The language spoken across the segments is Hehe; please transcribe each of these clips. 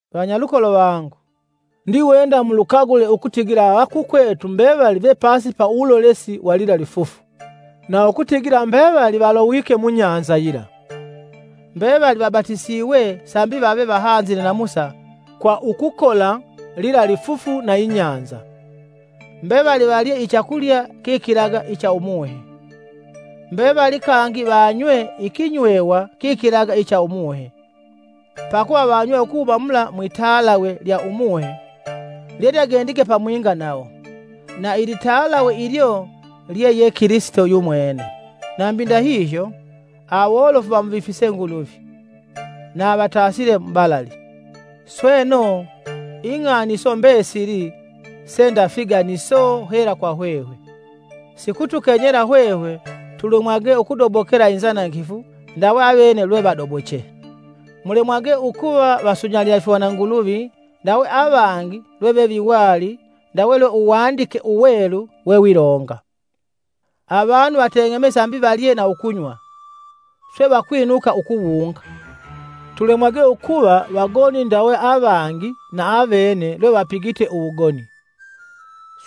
Vanyalukolo vangu, ndiwenda mulukagule ukutigila avakukwetu mbevali vepasi ya uwulolesi wa lila lifufu, na ukutigila mbevali valowike mubahali yila. Mbevali vabatisiwe sambi vave vahanzile na Musa kwa ukukola lila lifufu na ibahali. Mbevali valye ichakulya kikilaga icha Umuhe, mbevali kangi vanywe ikinywewa kikilaga icha umuhe, pakuva vanywe ukuhuma mula mwitalawe lya Umuhe lyelyagendige pamwinga nawo; na ilitalawe ilyo lye ye Kilisito yumwene. Nambi ndahihyo, awolofu vamuvifise Nguluvi, na avatasile mubalali. Sweno, ing'ani iso mbesili, se nda figaniso hela kwa hwehwe; sikutukenyela hwehwe tulemwage ukudobokela inzanangifu ndawe avene lwevadoboche. Mulemwage ukuva vasunyalila ifihwananguluvi ndawe avangi lweveviwali ndawe lwe Uwandike Uwelu wewilonga, “Avanu vateng'eme sambi valye na ukunywa, swe vakwinuka ukuwunga.” Tulemwage ukuva vagoni ndawe avangi va avene lwevapigite uwugoni,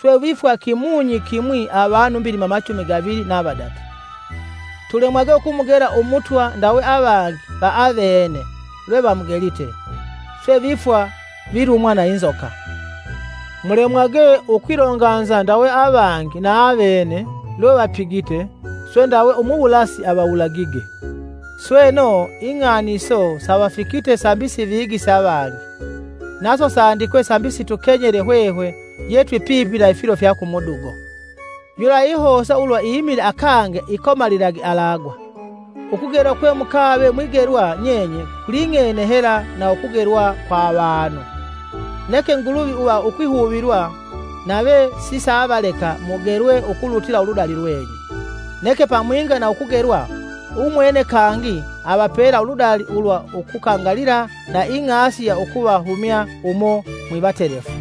swe vifwa kimunyi kimwi avanu mbilima machumi gavili na vadatu. Tulemwage ukumugela Umutwa ndawe avangi va avene lwevamugelite, swe vifwa vilumwa na inzoka. Mulemwage ukwilonganza ndawe avangi va avene lwevapigite, swe ndawe Umuwulasi avawulagige! Sweno, ing'ani iso savafikite sambi sivigise avangi, naso sandikwe sambi situkenyele hwehwe ye twipipi na ifilo fya kumudugo. Yula yeihosa ulwa imile akange ikomalilage alagwa. Ukugelwa kwe mukave mwigelwa nyenye kuling'ene hela na ukugelwa kwa avanu. Neke Nguluvi uva ukwihuvilwa, nave sisaavaleka mugelwe ukulutila uludali lwenyu, neke pamwinga na ukugelwa, umwene kangi avapela uludali ulwa ukukangalila na ing'asi ya ukuvahumya umo mwivatelefu.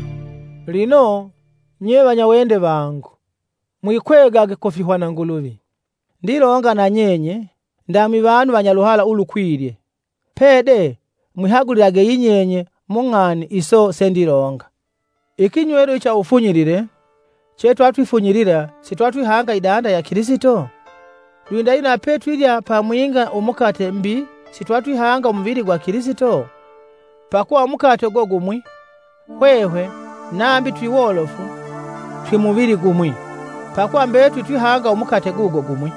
Lino, nye vanyawende vangu, mwepage ifihwananguluvi. Ndilonga nanyenye, ndamwivanu vanyaluhala ulukwilye, pede mwihagulilage yinyenye mung'ani iso sendilonga. Ikinywelo icha uwufunyilile, tukukifunyilila sitwatwihanga idanda ya Kilisito? Lwindahihyo na petwilya pamwinga umukate mbi, sitwatwihanga umuvili gwa Kilisito? Pakuva umukate ugo gumwi, hwehwe, nambi twiwolofu, twimuvili gumwi, pakuva mbetuli twihanga umukate gugo gumwi.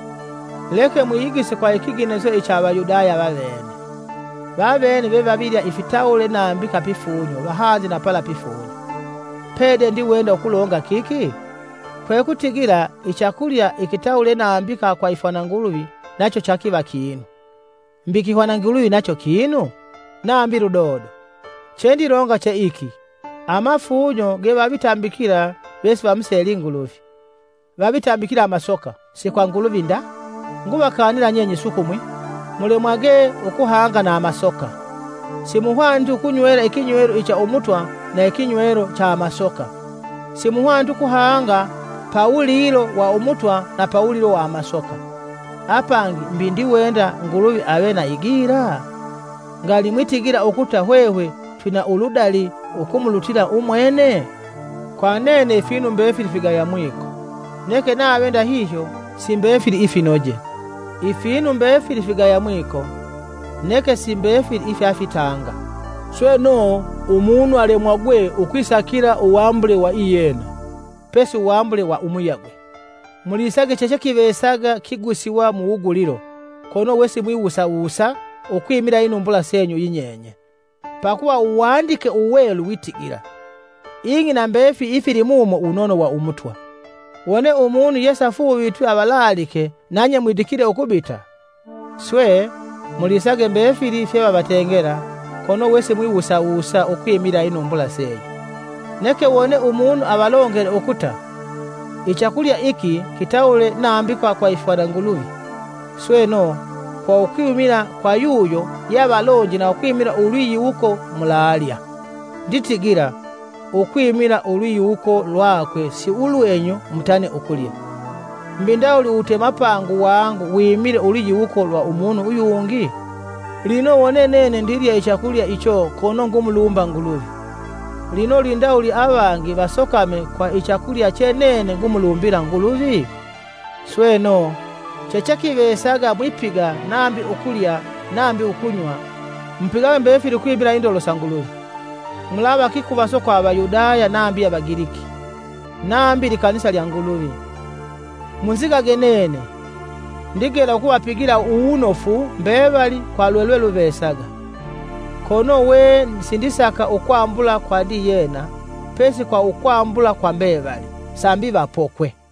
Leke mwiyigise kwa ikiganiso icha Avayudaya vavene, vavene vevavilya ifitawule nambika pifunyo vahanzile na pala pifunyo. Pede ndiwenda ukulonga kiki? Kwekutigila ichakulya ikitawule nambika kwa ifihwananguluvi nacho chakiva kinu, mbi ikihwananguluvi nacho kinu? Nambi ludodo! Chendilonga che iki amafunyo gevavitambikila vesivamuseli Nguluvi vavitambikila amasoka, si kwa Nguluvi nda. Nguvakanila nyenye sukumwi, mulemwage ukuhanga na amasoka. Simuhwaniti ukunywela ikinywelo icha Umutwa na ikinywelo cha amasoka, simuhwaniti ukuhanga pawulilo wa Umutwa na pawulilo wa amasoka. Apangi mbi twiwenda Nguluvi ave na igila? Ngali mwitigila ukuta hwehwe twina uludali ukumulutila umwene? Kwa nene ifinu mbefili vigaya mwiko, neke nave ndahihyo si mbefili ifinoje. Ifinu mbefili figaya mwiko neke si mbefili ifyafitanga. Sweno umunu alemwagwe ukusaka hela iyena, pesi uwambule wa umuyagwe. Mulisage chechekivesaga kigusiwa mu wugulilo kono we simwiwusa wusa ukwimila inumbula senyu yinyenye, pakuva Uwandike Uwelu witigila, “Ing'i na mbefili ifilimumo wunono wa Umutwa.” Wone umunu yesafuuvitwi avalaalike nanye mwidikile ukubita, swe, mulisage mbefili fyevavatengela kono we simwiwusawusa ukwimila inumbula senyu. Neke wone umunu avalongele ukuta, “Ichakulya iki kitawule nambika kwa ifihwananguluvi.” Sweno, kwa ukwimila kwa yuyo yeavalonje na ukwimila ulwiyiwuko mulalya. Nditigila, “Ukwimila ulwiyiwuko lwakwe si ulwenyu mutane ukulya.” “Mbi ndawuli uwutemapangu wangu wimile ulwiyiwuko lwa umunu uyungi? Lino wone nene ndilya ichakulya icho kono ngumulumba Nguluvi, lino lwindawuli avangi vasokame kwa ichakulya che nene ngumulumbila Nguluvi?” Sweno, chechekivesaga mwipiga nambi ukulya nambi ukunywa, mupigage mbefili ukwimila indolo sa Nguluvi. Mulava kikuvaso kwa Avayudaya nambi Avagiliki, nambi likanisa lya Nguluvi. Munzigage nene, ndigela ukuvapigila uwunofu mbevali kwa lwelweluvesaga, kono we sindisaka ukwambula kwa ndiyena pesi kwa ukwambula kwa mbevali, sambi vapokwe.